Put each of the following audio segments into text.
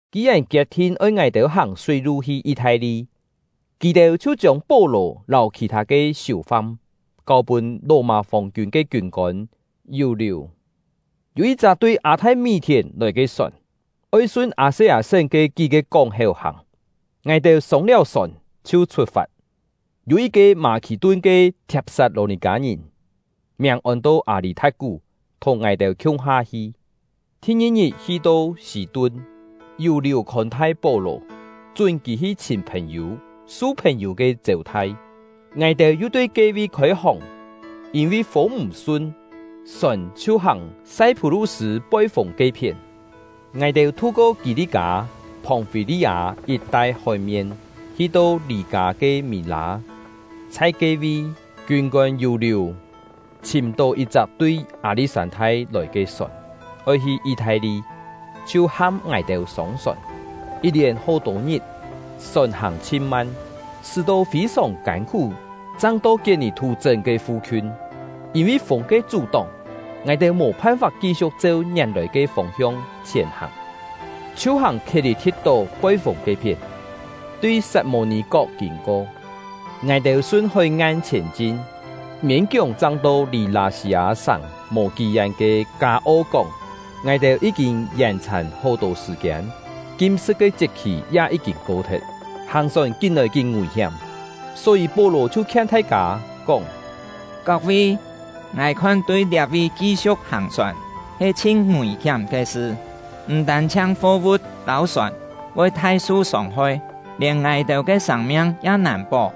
Ki-yèn kiet-thin oi ngài-têu hàng súi-lu hi Yi-thai-li, kì-têu chhiu chiông Pó-lò lâu khì-thâ siù-fam kâu-pûn Lò-mâ fòng-kiûn ke kiûn-kôn Yù-liù. Yû yit-chak tui Â-thai-mí-thièn lòi ke sòn, oi sun Â-se-â-sén ke kí-ke kóng-héu hàng. Ngài-têu sông-liáu sòn, chhiu chhut-fat. Yû yit-ke Mâ-khì-tun ke Thiap-sat-lò-nì-kâ-ngìn, miàng ôn-to Â-lî-tha̍t-kú, thùng ngài-têu khiung-ha hi. Thi-ngi-ngit hi-to Sî-tun, Yù-liù khôn-thai Pó-lò, chún kì hi chhìm phèn-yû, su phèn-yû ke chêu-thai. Ngài-têu yu tui ke-vi khôi-hòng, yîn-vi fûng m̀ sun, sòn chhiu hàng Sai-phú-lu-sṳ̂ poi-fûng ke-phién. Ngài-têu thu-ko Kî-li-kâ, Phòng-fî-li-â yit-tai hói-mien, hi-to Lî-kâ ke Mî-lâ. Chhai ke-vi, kiûn-kôn Yù-liù chhìm-tó yit-chak tui Â-li̍t-sân-thai lòi ke sòn, oi hi Yi-thai-li, chhiu ham ngài-têu sông-sòn. Yit-lièn hó-tô ngit, sòn hàng chhin man, sṳ́-to fî-sòng kân-khú chang to Kiet-nì-thú-chṳ́n fu-khiun. Yîn-vi fûng ke chú-tóng, ngài-têu mò phan-fap ki-siu̍k cheu ngièn-lòi ke fông-hiong chhièn-hàng, chhiu hàng Khiet-lî-thi̍t-tó poi-fûng ke-phién, tui Sat-mô-nì-kok kîn-ko. Ngài-têu sun hói-ngan chhièn-chin, miên-kióng chang to lì Lâ-sî-â-sàng mò kí-yén ke “Kâ-o-kóng”. Ngài-têu yí-kîn yèn-chhàn hó-tô sṳ̀-kiên, kim-sṳ̍t ke chiet-khì ya yí-kîn ko-thet, hàng-sòn kín-lòi kín ngùi-hiám; só-yî Pó-lò chhiu khien thai-kâ, kóng: “Kok-vi, ngài khon tui liá-vi ki-siu̍k hàng-sòn he chhin ngùi-hiám ke sṳ; m̀ tân-chhiang fo-vu̍t lâu sòn voi thai su sông-hoi, lièn ngài-têu ke sâng-miang ya nàn pó.”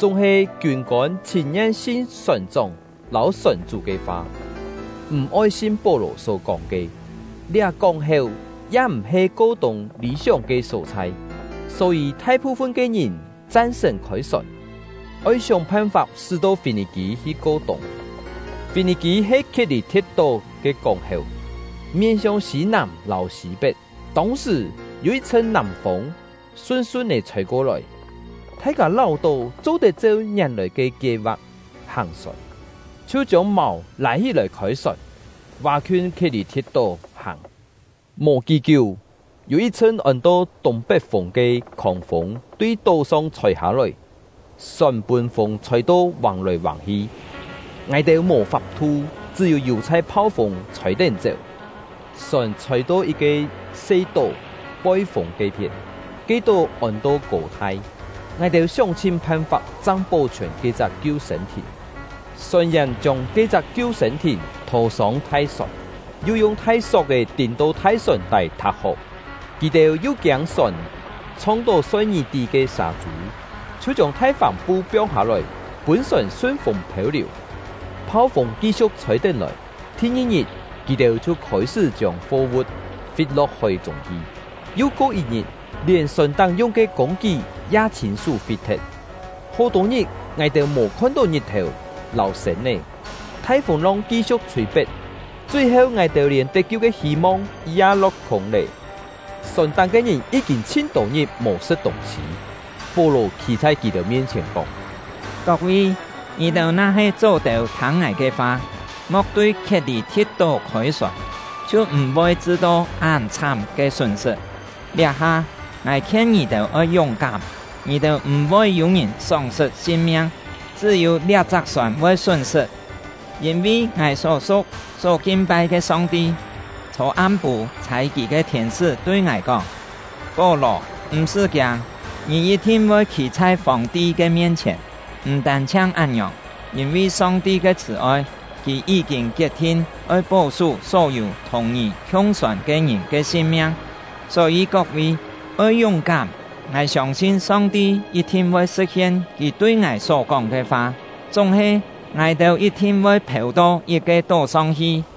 Chúng-he, kiûn-kôn chhìn-ngien sin sòn-chóng lâu sòn-chú ke fa, m̀-oi sin Pó-lò só kóng ke. Liá kóng-héu ya m̀-he ko-tûng lî-sióng ke só-chhai; só-yî thai-phu-fun ke ngìn chan-sṳ̀n khôi-sòn, oi sióng phan-fap sṳ́-to Fî-nì-kî hi ko-tûng. Fî-nì-kî he Khiet-lî-thi̍t-tó ke kóng-héu, mien-hiong sî-nàm lâu sî-pet. Tông-sṳ̀, yû yit-chhṳn nàm-fûng sun-sun-é chhôi-ko-lòi, thai-kâ láu-tó cho-tet cheu ngièn-lòi ke kie-va̍k hàng-sòn, chhiu chiông màu lâi hí-lòi khôi-sòn, vá-khiun Khiet-lî-thi̍t-tó hàng. Mò kí-kiú, yû yit-chhṳn ôn-to “Tûng-pet-fûng” ke khòng-fûng tui tó-song chhôi-hâ-lòi. Sòn pûn fûng chhôi-to vàng-lòi vàng-hi, ngài-têu mò fap-thu, chṳ́-yû yù-chhai phau-fûng chhôi-tén chéu. Sòn chhôi-to yit-ke se tó poi-fûng ke-phién; ke tó ôn-to Kô-thai. Ngài-têu sióng-chhin phan-fap chang pó-chhiòn ke-chak kiu-sên-thìn. Sòn-yèn chiông ke-chak kiu-sên-thìn thô-sông thai-sòn, yu yung thai sok-è tîn-to thai sòn-tái thò-hó. Kì-têu yu kiâng sòn chhong-tó Soi-ngí-tí ke sâ-chû, chhiu chiông thai fàm-pu piong-hâ-lòi, pûn sòn sun fûng phêu-liù. Phau-fûng ki-siu̍k chhôi-tén lòi, thi-ngi-ngit, kì-têu chhiu khôi-sṳ́ chiông fo-vu̍t fit-lo̍k hói-chûng hi, yu ko yit-ngit, lièn sòn-táng yung ke kûng-kí ya chhîn-sú fit-thet. Hó-tô ngit, ngài-têu mò khon-tó ngit-thèu lâu sên-é; thai fûng-long ki-siu̍k chhûi-pet, chui-heu, ngài-têu lièn tet-kiu ke hî-mong ya lo̍k-khûng lé. Sòn-táng ke ngìn yí-kîn chhin-tô ngit mò sṳ̍t tûng-sî, Pó-lò khî chhai kì-têu mien-chhièn kóng: “Kok-vi, ngì-têu na-he chó-têu thâng ngài ke fa, mo̍k tui Khiet-lî-thi̍t-tó khôi-sòn, chhiu m̀-voi chṳ-tó án chhám ke sún-sṳt. Liá-ha, ngài khien ngì-têu oi yúng-kám, ngì-têu m̀-voi yû-ngìn sóng-sṳt sin-miang, chṳ́-yû liá-chak sòn voi sún-sṳt. Yîn-vi ngài só su̍k, só kin-pai ke Song-ti, chhô-am-pû chhâi Kì ke thiên-sṳ́ tui ngài kóng: ‘Pó-lò, m̀-sṳ́ kiâng! Ngì yit-thin voi khî chhai Fòng-ti ke mien-chhièn. M̀ tân-chhiang án-ngiòng, yîn-vi Song-ti ke chhṳ̀-oi, Kì yí-kîn kiet-thin oi pó-sú só-yû thùng ngì khiung-sòn ke ngìn ke sin-miang.’ Só-yî kok-vi, oi yúng-kám; ngài siông-sin Song-ti yit-thin voi sṳ̍t-hien Kì tui ngài só-kóng ke fa. Chúng-he, ngài-têu yit-thin voi phêu-to yit-ke tó-song hi.”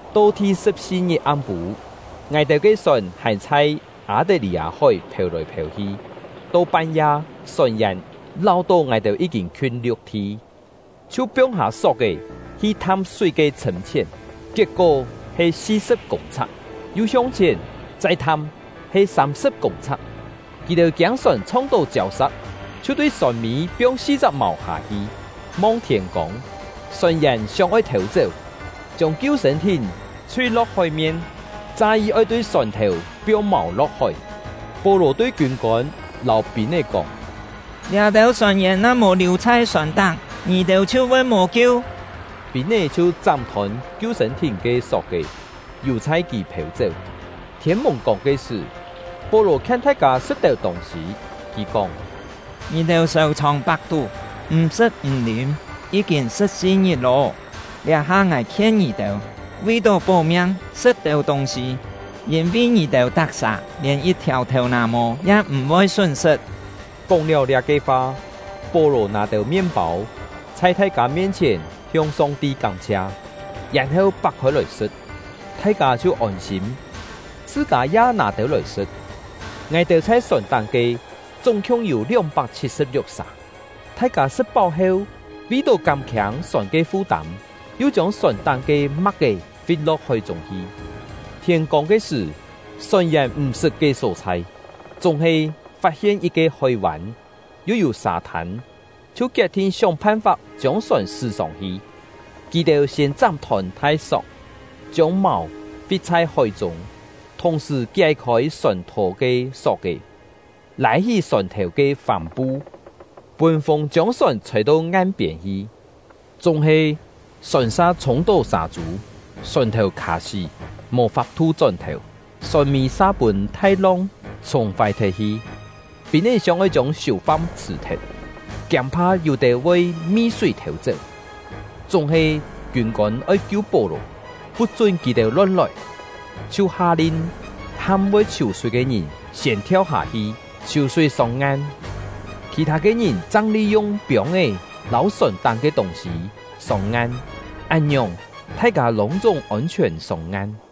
To thi-sṳ̍p-si ngit am-pû, ngài-têu ke sòn hàn chhai Â-tet-lî-â-hói phêu-lòi phêu-hi. To pan-ya, sòn-yèn láu-tó ngài-têu yí-kîn khiûn liu̍k-thi, chhiu piong-hâ sok-è hi tham súi ke chhṳ̂m-chhién, kiet-kó he si-sṳ̍p kûng-chhak; yu hiong chhièn, chai tham, he sâm-sṳ̍p kûng-chhak. Kì-têu kiâng sòn chhong-tó chiâu-sa̍k, chhiu tui sòn-mî piong si-chak màu hâ-hi, mong thiên-kông. Sòn-yèn sióng-oi thêu-chéu, chiông kiu-sên-thìn chhui-lo̍k hói-mien, cha-yi oi tui sòn-thèu piong màu lo̍k hói. Pó-lò tui kiûn-kôn lâu pîn-é kóng: “Liá-têu sòn-yèn na mò liù chhai sòn-táng, ngì-têu chhiu voi mò kiu.” Pîn-é chhiu chám-thôn kiu-sên-thìn ke sok-è, yù-chhai kì phêu-chéu. Thiên-mùng-kông ke sṳ̀, Pó-lò khien thai-kâ sṳ̍t têu tûng-sî. Kì kóng: “Ngì-têu sèu-chhòng pak-tú, m̀ sṳ̍t m̀ lîm, yí-kîn sṳ̍p-si ngit lô. Liá-ha ngài khien ngì-têu, vi-tó pó-miang, sṳ̍t têu tûng-sî, yîn-vi ngì-têu tak-sà lièn yit-thiàu thèu-nà-mô ya m̀-voi sún-sṳt.” Kóng-liáu liá-ke fa, Pó-lò nâ têu mien-pâu, chhai thai-kâ mien-chhièn hiong Song-ti kám-chhia, yèn-heu pak-khôi lòi sṳ̍t. Thai-kâ chhiu ôn-sîm, chhṳ-kâ ya nâ têu lòi sṳ̍t. Ngài-têu chhai sòn-táng ke chúng-khiung yû lióng-pak chhit-sṳ̍p-liuk sà. Thai-kâ sṳ̍t-páu heu, vi-tó kám-khiâng sòn ke fu-tâm, yu chiông sòn-táng ke ma̍k-é fit-lo̍k hói-chûng hi. Thiên-kông ke sṳ̀, sòn-yèn m̀-sṳt ke só-chhai, chúng-he fat-hien yit-ke hói-vân, yu yû sâ-thân, chhiu kiet-thin sióng phan-fap chiông sòn sṳ́ sông-hi. Kì-têu siên chám-thôn thai-sok, chiông màu fit chhai hói-chûng, thùng-sṳ̀ kié-khôi sòn-thò ke sok-è, lâi-hí sòn-thèu ke fàm-pu, pûn fûng chiông sòn chhôi-to ngan-piên hi. Chúng-he, sòn sa chhûng-tó sâ-chû, sòn-thèu khà-sí, mò fap-thu chón-thèu, sòn-mî sa pûn thai-long chhùng-fái thet-hi. Pîn-é sióng-oi chiông siù-fam chhṳ̀-thet, kiâng-pha yû-têu voi mi-súi thêu-chéu. Chúng-he, kiûn-kôn oi kiu Pó-lò, put-chún kì-têu lon-lòi, chhiu ha-lin ham voi chhiù-súi ke ngìn siên thiau hâ-hi, chhiù-súi sông-ngan; khì-thâ ke ngìn chang li-yung piông-é lâu sòn-táng ke tûng-sî sông-ngan. Án-ngiòng, thai-kâ lûng-chúng ôn-chhiòn sông-ngan.